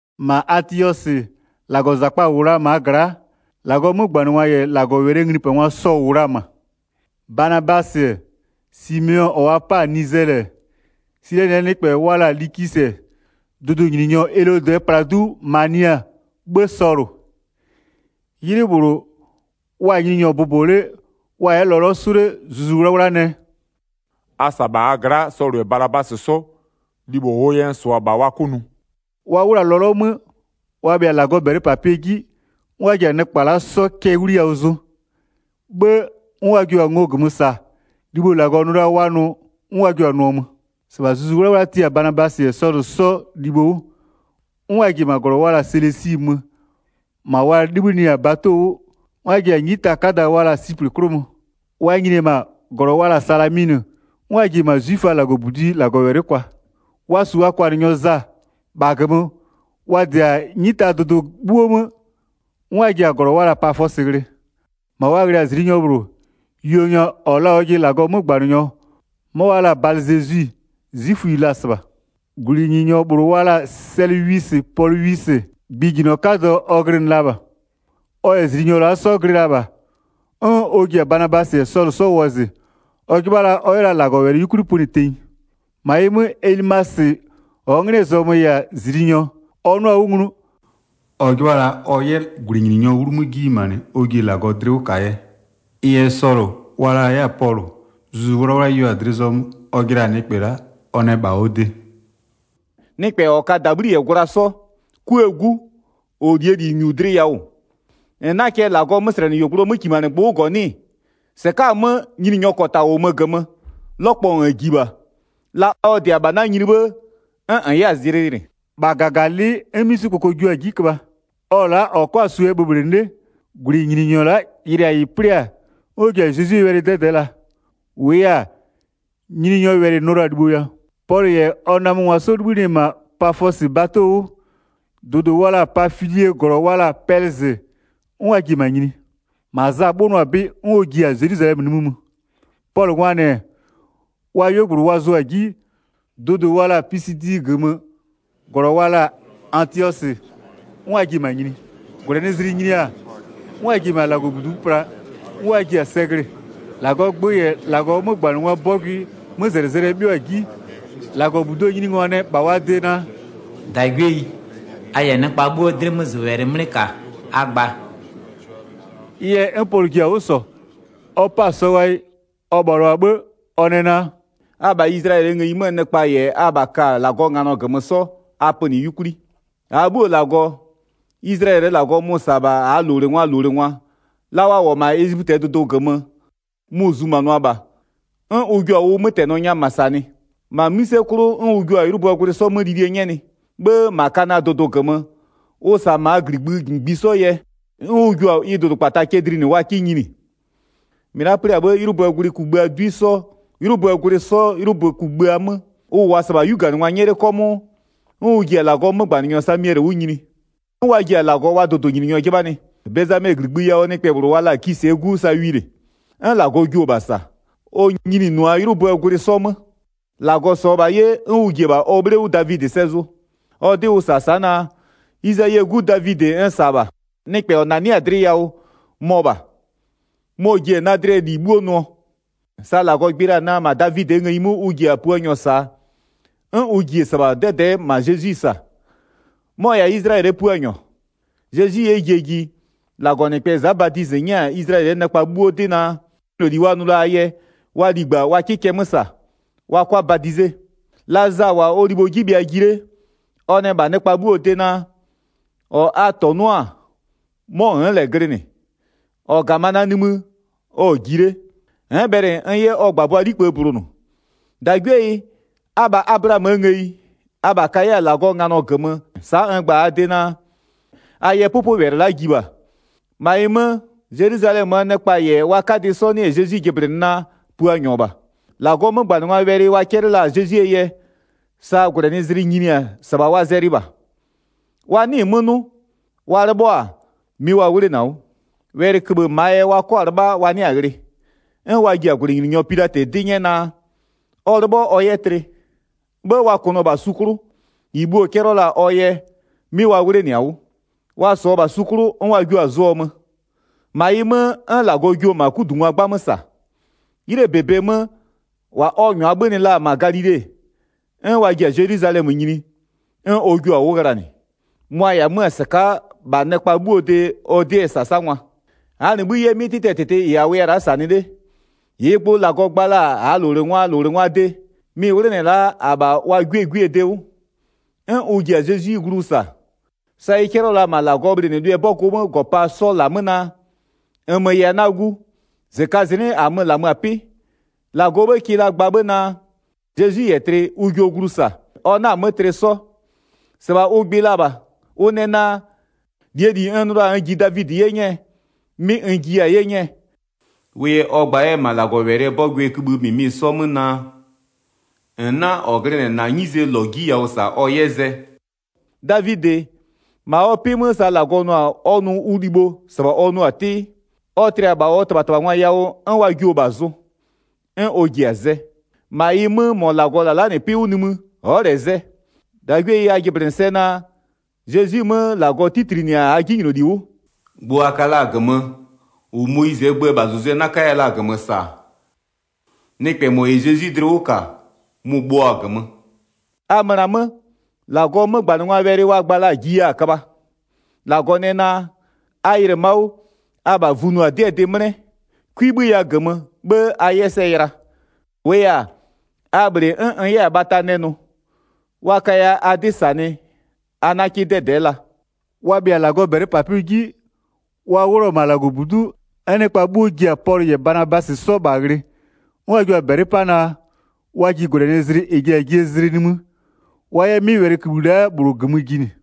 1-Ma Atiɔsɩ, -Lagɔzakpa-a -wʋ la-a -maa gla'a, -Lagɔɔ 'mögbanɩngwa -yɛ -Lagɔwɛlɩɛ nglipangwa sɔ-ɔ -wʋ la-a -ma. Banabasɩ, Simeɔ -ɔ wa 'pa-a Nizɛlɩ, Silɛnɩɛ nɩkpɛ wa la-a Likisɩ, dʋdʋnyininyɔ Elodɩɛ pladu Mania, 'bhë Sɔlʋ. 'Ylɩ -bhlʋ, wa-a Nyininyɔ bʋbɔ 'le, wa-a 'yɛ lɔlɔ 'sʋ 'le, Zuzu 'Wlawla nɛ: “A -sa -ma a gla'a Sɔlʋ -yɛ Banabasɩ 'sɔ, libho -ʋʋ yɛ n -sʋa-a -bha wa 'kʋ nʋ.” Wa 'wlʋ-a lɔlɔ 'mö, wa bhɩa-a -Lagɔɔ -bɛlɩpapɩɛ 'ji, 'n wa ji-a nɩkpa la'a 'sɔ cɛ 'wliyawʋ zʋ, 'bhë 'n wa jua-a ngo -gömö -sa, libho -Lagɔ nʋ la-a wa nʋ 'n wa ju-a nʋɔ mö. Banabasɩ -yɛ Sɔlʋ 'sɔ yɛ -ma Siplɩ nyini 4-Sɩbha Zuzu 'Wlawla tia-a Banabasɩ -yɛ Sɔlʋ 'sɔ libho 'wʋ, 'n wa ji-e -ma -glɔ wa la-a Selesi, -ma wa 'libhïnɩ-a bato 'wʋ, 'n wa ji-a 'nyita 'kada wa la-a Siplɩ 'klʋ mö. Wa nyini-e -ma -glɔ wa la-a Salaminɩ, 'n wa ji-e -ma 'zwiföaa -Lagɔbudi'i -Lagɔwɛlɩ kwa. Wa -su wa kwanɩnyɔ Za. 6-Bha -gömö, wa -dɩ-a 'nyitadʋdʋ 'bhuo 'mö, 'n wa ji-a -glɔ wa la-a Pafɔsɩ ghlɩ. -Ma wa ghlɩ-a -zliinyɔ -bhlʋ, yuonyɔ -ɔ la-a ɔjɩ -Lagɔɔ 'mögbanɩnyɔ, 'mɔ wa la-a Balɩzezwi, 'zwiföyi la-a -sɩbha. 7-Gwlɩnyininyɔ -bhlʋ wa la-a Sɛlɩzwisɩ Polwisɩ, gbɩjinyɔ 'kadɔ ɔ glɩnɩ la -bha, ɔ -yɛ -zliinyɔ la'a 'sɔ glɩ -bha, 'n ɔ ji-a Banabasɩ -yɛ Sɔlʋ 'sɔ wɔzɩ, ɔ 'jɩbha ɔ 'yɛ la -Lagɔwɛlɩ 'yukwli pönɩ tenyi. 8-Ma ɩ 'mö Elimasɩ -ɔɔ 'nglɩɛ zɔmö -yɛ-a -zliinyɔ, ɔ 'nʋa-a 'wʋ nglu, ɔ 'jɩbha la ɔ 'yɛ -gwlɩnyininyɔɔ 'wlu 'mö 'ji nyimanɩ ɔ ji-e -Lagɔ dlɩ 'wʋ -kaa yɛ. Ɩ yɛ Sɔlʋ, wa la 'yɛ-a Pɔlʋ, Zuzu 'Wlawla yeo-a dlɩ zɔmö ɔ jɩla-a nɩkpɛ la'a, ɔ nɛ -bha ɔ de: “Nɩkpɛ -ɔ ka -dabhli -yɛ gwla 'sɔ, 'kuëë 'gu, -ɔ -lie -li -nyu dlɩ yawʋ, -n 'naa cɛ -Lagɔɔ 'möslɛnɩyuogblʋɔ 'mökimanɩgbʋ 'wʋ -gɔ 'nɩ-ɩ? 11-Sɩka'a-a 'mö, Nyininyɔɔ -kɔta -wʋmö -gömö, 'lɔkpɔ -n ji -bha, la ɔ -dɩ-a -bha na nyini 'bhë -n 'yɛ-a zlɩ yɩlɩ.” -Bha -gaganɩlɩ'ɩ, 'n 'misikpoko jio-a 'ji köbha, ɔ-ɔ la'a -ɔ 'kɔ-a -suo yɛ bhöbhlɩnɩ 'le. 12-Gwlɩnyininyɔ la'a yɩlɩ-a -ɩ 'plɩ-a, 'n ɔ ji-a Zezwie wɛlɩ 'dɛdɛ'ɛ la. -Wʋʋ yɛ-a, Nyininyɔɔ wɛlɩ-ɩ nʋɔ la-a libho yawʋ. Pɔlʋ -yɛ ɔ namöngwa 'sɔ 'libhïnɩ-ɛ -ma Pafɔsɩ bato 'wʋ, dʋdʋ wa la-a Pafilie -glɔ wa la-a Pɛlɩzɩ, 'n wa ji-e -ma nyini. -Ma Za 'bhönʋa-a 'bɩ 'n ɔ ji-a Zelwizalɛmö nimï mö. Pɔlʋngwaa -nɩ, wa 'yuogblʋ wa zʋ-a 'ji, dʋdʋ wa la-a Pisidie -gömö -glɔ wa la-a Atiɔsɩ, 'n wa ji-e -ma nyini. -Gwlɛnɩzlɩ nyini-a, 'n wa ji-e -ma -Lagɔbudu'u pla 'n wa ji-a sɛ glɩ-ɩ. 15-Lagɔɔ gbö -yɛ -Lagɔɔ 'mögbanɩngwaa 'bɔgʋɩɛ 'mözɛlɩzɛlɩɛ 'bhɩɔ-a 'ji, -Lagɔbuduo nyiningwa nɛ -bha wa de naa: “-Dagwieyi, a -yɛ nɩkpa 'bhuoo 'dɩmözʋwɛlɩ 'mlɩ -ka, a gba.” Ɩ yɛ, 'n Pɔlʋ ji-a 'wʋ -sɔ, ɔ 'pa-a sɔ ghayɩ ɔ bhalʋa-a 'bhë, ɔ nɛ naa: “Abha Izlayɛlɩɛ ngëyi 'möö nɩkpa -yɛ abha ka-a -Lagɔɔ nganɔ -gömö 'sɔ, a pönɩ 'yukwli. 17-Aa 'bhuoo -Lagɔ, Izlayɛlɩɛ -Lagɔ mʋ-ʋ -sa-a -bha -aa -lowlengwaa -lowlengwa, la wa -wʋ-ɔ -ma Ezipötɩɛ dʋdʋ -gömö, mʋ-ʋ zumanʋa -bha, 'n ʋ jua-a ʋ 'mötɛnɩsɔ nya -ma -sanɩ. 18-Ma 'mïse 'klʋ, 'n ʋ jua-a 'ylʋböö gwlɩ 'sɔ mö lilie 'nyɛnɩ. 'Bhë -ma Kanaa dʋdʋ -gömö, ʋ -sa -maa -gligbï -ngbisɔ yɛ, 'n ʋ jua-a ɩ dʋdʋkpata cɛ dlinɩ wa 'ka nyini. 20-Mɩ la'a 'plɩ-a 'bhë, 'ylʋböö gwlɩ kugbïaa 'dwi 'sɔ 'ylʋböö gwlɩ 'sɔ 'ylʋbö kugbïa 'mö, ʋ -wʋʋa -sɩbha 'yuganɩngwa 'nyɛ 'le 'kɔmʋʋ, 'n ʋ ji-a -Lagɔɔ 'mögbanɩnyɔ Samiɛlɩ 'wʋ nyini. 'N wa ji-a -Lagɔ wa dʋdʋnyininyɔ 'jɩbhanɩ. Bezamɛɛ -gligbï yawʋɔ nɩkpɛ -bhlʋ wa la-a Kisɩɛ 'gu Sawilɩ, 'n -Lagɔ jio-o -bha -sa, ɔ nyinɩnʋa 'ylʋböö gwlɩ 'sɔ 'mö. 22-Lagɔ -sɔɔ-ɔ -bha 'ye, 'n ʋ ji-e -bha ɔ 'bhle 'wʋ Davidɩ sɛ zʋ. Ɔ 'dɩ ʋ -sa-a sa'a naa: Izayie 'gu Davidɩ n -sa-a -bha. Nɩkpɛ -ɔ -nanɩ'ɩ-a dlɩ yawʋ mɔ -bha. Mɔ-ɔ ji-e na dlɩɛ -li 'bhuo nʋɔ. Sa -Lagɔ gbɩ la-a naa, -ma Davidɩɛ ngëyi 'mö ʋ ji-a Puanyɔ -saa, 'n ʋ ji-e -sɩbha 'dɛdɛ'ɛ -ma Zezwi -sa, mɔ-ɔ -yɛ-a Izlayɛlɩɛ Puanyɔ. Zezwi 'yɛ jie ji, -Lagɔnɩkpɛ Za Badizɩ 'nyɛ-a Izlayɛlɩɛ nɩkpa 'bhuo 'dɩ naa, 'jinyloli wa nʋ la-aa yɛ, wa ligba wa 'kɩ cɛ 'mö -sa, wa 'kʋa badize. La Za -wʋ-a ɔ libho 'ji bhɩa ji 'le, ɔ nɛ -bha nɩkpa 'bhuo de naa: -Ɔ a -tɔnʋ'ʋ-a 'mɔ n'n -lɛ glɩnɩ. -Ɔ -ga-a -ma na nimï ɔ-ɔ ji 'le, n'n bhɛlɩ n 'yɛ ɔ -gbabʋakplee 'likpë bulonʋ. 26-Dagwieyi, abha Ablaamöö ngëyi, abha ka 'yɛ-a -Lagɔɔ nganɔ -gömö sa'a n gba-a a de naa, a yɛ 'pʋpʋwɛlɩ la'a ji -bha. 27-Ma ɩ 'mö, Zelwizalɛmöö nɩkpa -yɛ wa 'kadɩ 'sɔ 'nɩ-ɛ Zezwi jɩblɩnɩ naa, Puanyɔ -bha. -Lagɔɔ 'mögbanɩngwaa wɛlɩ wa 'cɛlɩ la-a Zezwie yɛ, sa -gwlɛnɩzlɩ nyini-a -sɩbha wa zɛlɩɩ -bha. Wa 'nɩɩ-ɩ 'mö 'nʋ, wa 'lɩbhɔ-a, 'mɩ wa 'wlenɩ-a 'wʋ. Wɛlɩköbhë -maa yɛ wa 'kɔ-a 'lɩbha wa 'nɩa-a ghlɩ. 'N wa ji-a -gwlɩnyininyɔ Pilatɩ 'dɩ 'nyɛ naa, ɔ 'lɩbhɔ ɔ yɛ tlɩ. 'Bhë wa kʋnʋɔ-ɔ -bha su 'klʋ, -ɩ bhuo-o 'cɛlɩɔ-ɔ la-a ɔ yɛ, 'mɩ wa 'wlenɩ-a 'wʋ. Wa -sɔɔ-ɔ -bha su 'klʋ, 'n wa jio-a zʋɔ mö. 30-Ma ɩ 'mö, 'n -Lagɔ jio-o -ma 'kudungwa 'gbamö -sa. 'Ylɩɛ -bebe 'mö, -wa ɔ -nyʋa 'bhönɩ la-a -ma Galile, 'n wa ji-a Zelwizalɛmö nyini, 'n ɔ jua-a 'wʋ ghlanɩ, mʋa-a -yɛ-a 'mö-ö -sɩka'a -bha nɩkpa 'bhuoo de ɔ 'dɩɛ -sasangwa. 32-Aa -nɩ 'bhï 'yɛ, 'mɩ 'tɩtɩɛ -tɩtɩ -ɩ -a wʋya-a la'a -sanɩ 'le, -ɩɩ gbʋ -Lagɔ gba la-a -aa -lowlengwaa -lowlengwaa de, mɩ-ɩ 'wlenɩ-ɛ la'a -abha wa 'gwie gwiee de 'wʋ. 'N ʋ ji-a Zezwi glu -sa, sa ɩ 'cɛlɩɔ-ɔ la-a -ma -Lagɔɔ bhlɩnɩlʋɩɛ 'bɔgʋɔ -gɔpaa 'sɔ -la 'mö naa: -Nmö -yɛ-a na gu, -zɩkazɩnɩ'ɩ -amö-ö -lamö-a 'pɩ. 34-Lagɔɔ 'bhë kɩ la gba 'bhë naa: Zezwi -yɛ tlɩ, ʋ jio glu -sa, ɔ 'na-a 'mö tlɩ 'sɔ. -Sɩbha ʋ gbɩ la -bha. Ʋ nɛ naa: -Lie -li n nʋ la-a n ji Davidɩ 'ye 'nyɛɛ, 'mɩ n jiya-a 'ye 'nyɛɛ. Wʋ yɛ ɔ gba 'yɛ-ɛ -ma -Lagɔwɛlɩɛ 'bɔgʋɔ kïbhï -mɩmɩ 'mö 'sɔ naa: -N 'na -ɔ glɩnɩ-ɛ -na 'nyizee -lɔ 'ji yawʋ -sa ɔ 'yɛ zɛ. Davidɩ, -ma ɔ 'pɩ 'mö sa -Lagɔ nʋ-a ɔ nʋ ʋ libho -sɩbha ɔ nʋʋ-a 'tɩ, ɔ tlɩ-a -bha ɔ -tɩbhatɩbhangwa yawʋ 'n wa jio-o -bha zʋ, 'n ɔ ji-a zɛ. 37-Ma ɩ 'mö -mɔ -Lagɔ -la la'a 'pɩ 'wʋ nimï, ɔ'ɔ -lɛ zɛ. 38-Dagwieyi, a jɩblɩnɩ sɛ naa: Zezwi 'mö -Lagɔ 'titlinɩ-a -aa 'jinyloli 'wʋ. Gbʋ a ka la-a -gömö, -ʋ Moyizɩɛ gböö -bhazʋzʋɛ 'na 'kaya la-a -gömö -sa-a, nɩkpɛ -mɔ -yɛ Zezwi dlɩ 'wʋ -ka mʋ-ʋ bhöɔ-a -gömö. A möna-a 'mö, -Lagɔɔ 'mögbanɩngwaa wɛlɩ wa gba la-a jiya-a köbha: 41-Lagɔ nɛ naa: A yɩlɩ-ɩ ma'a, abha vunʋa-a 'dɩɛ dɩ 'mlɛ, 'kwi 'bhöya -gömö, 'bhë a 'yɛ sɛ yɩla. -Wʋʋ yɛ-a, a -bhlɩ 'n n 'yɛ-a bhata nɛ nʋ, wa kaya a 'dɩ -sanɩ a 'na 'kɩ 'dɛdɛ'ɛ la.” Wa bhɩa-a -Lagɔɔ -bɛlɩpapɩɛ 'ji, wa 'wlʋ-ɔ -ma -Lagɔbudu'u, 'n nɩkpa 'bhuo ji-a Pɔlʋ -yɛ Banabasɩ 'sɔ -bha ghlɩ, 'n wa jua-a -bɛlɩ 'pa naa, wa ji -gwlɛnɩzlɩ -ɛ ji-a jie zlɩ nimï, wa 'yɛ 'mɩ wɛlɩkïbhï la'a -bhlʋ -gömö jinɩ.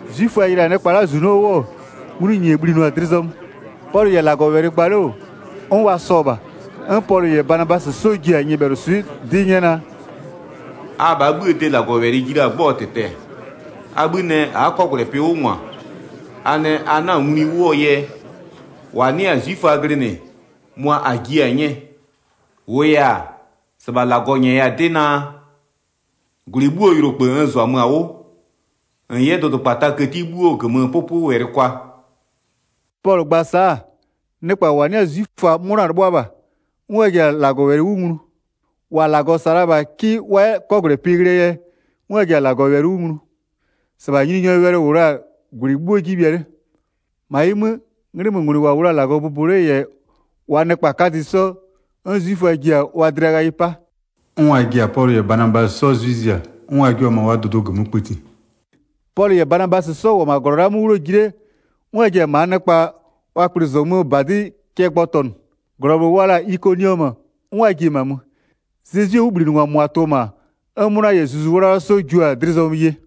'Zwiföa yɩlɩ-a nɩkpaa -zunɔ 'wʋ, nglʋnyinye bhlinʋa-a dlɩ zɔmö. Pɔlʋ -yɛ -Lagɔwɛlɩ gba 'le -wʋ, 'n wa sɔ -bha. 'N Pɔlʋ -yɛ Banabasɩ 'sɔ jua-a nyɩbhɛlʋswɩ'ɩ 'dɩ 'nyɛ naa: “Abhaa 'bhïë de -Lagɔwɛlɩ ji la-a 'gbɔɔ -tɩtɛ-ɛ. A 'bhï nɛ a'a 'kɔgwlɛpɩ 'wʋ -ngwa, a nɛ a 'na-a nglui 'wʋɔ yɛ -wa 'nɩ-a 'zwiföa glɩnɩ mʋa -a jiɩ-a 'nyɛɛ. 47-Wʋʋ yɛ-a, -sɩbha -Lagɔ -nyɛya-a 'dɩ naa: -Gwlɩ 'bhuoo yʋlokpë n -zʋamö-a 'wʋ -n 'yɛ dʋdʋkpataa këti 'bhuoo -gömö 'pʋpʋwɛlɩ kwa.” Pɔlʋ gba-a sa'a, nɩkpa -wa 'nɩ-a 'zwiföa 'mʋna-a 'lɩbhʋa -bha, 'n wa ji-a -Lagɔwɛlɩ 'wʋ nglu. -Wa -Lagɔ -sa la-a -bha 'kɩ wa 'yɛ 'kɔgwlɛpɩ ghlɩɛ yɛ, 'n wa ji-a -Lagɔwɛlɩ 'wʋ nglu. 49-Sɩbha Nyininyɔɔ wɛlɩ -wʋ la-a -gwlɩ 'bhuo 'ji bhɩa 'le. 50-Ma ɩ 'mö, 'nglɩmöngwlɩ -wa -wʋ la-a -Lagɔ bʋbɔ 'le -yɛ wa nɩkpa 'kadɩ 'sɔ, 'n 'zwiföa ji-a wa dlɩa ghayɩ 'pa, 'n wa ji-a Pɔlʋ -yɛ Banabasɩ 'sɔ 'zwɩ zia, 'n wa jua-a -ma wa dʋdʋ -gömö kpëti. Pɔlʋ -yɛ Banabasɩ 'sɔ -wʋ-ɔ -ma -glɔ la'a 'mö 'wlʋɔ ji 'le, 'n wa ji-a -maa nɩkpa wa kplɩzɔmöö -badɩ cɛ gbɔtɔnʋ. -Glɔ -bhlʋ wa la-a Ikoniɔmö, 'n wa ji-e -ma mö. Zezwie 'wʋbhlinɩngwa -mʋa tʋ-ɔ -ma, 'n 'mʋna -yɛ Zuzu 'Wlawla 'sɔ jua-a dlɩ zɔmö ye.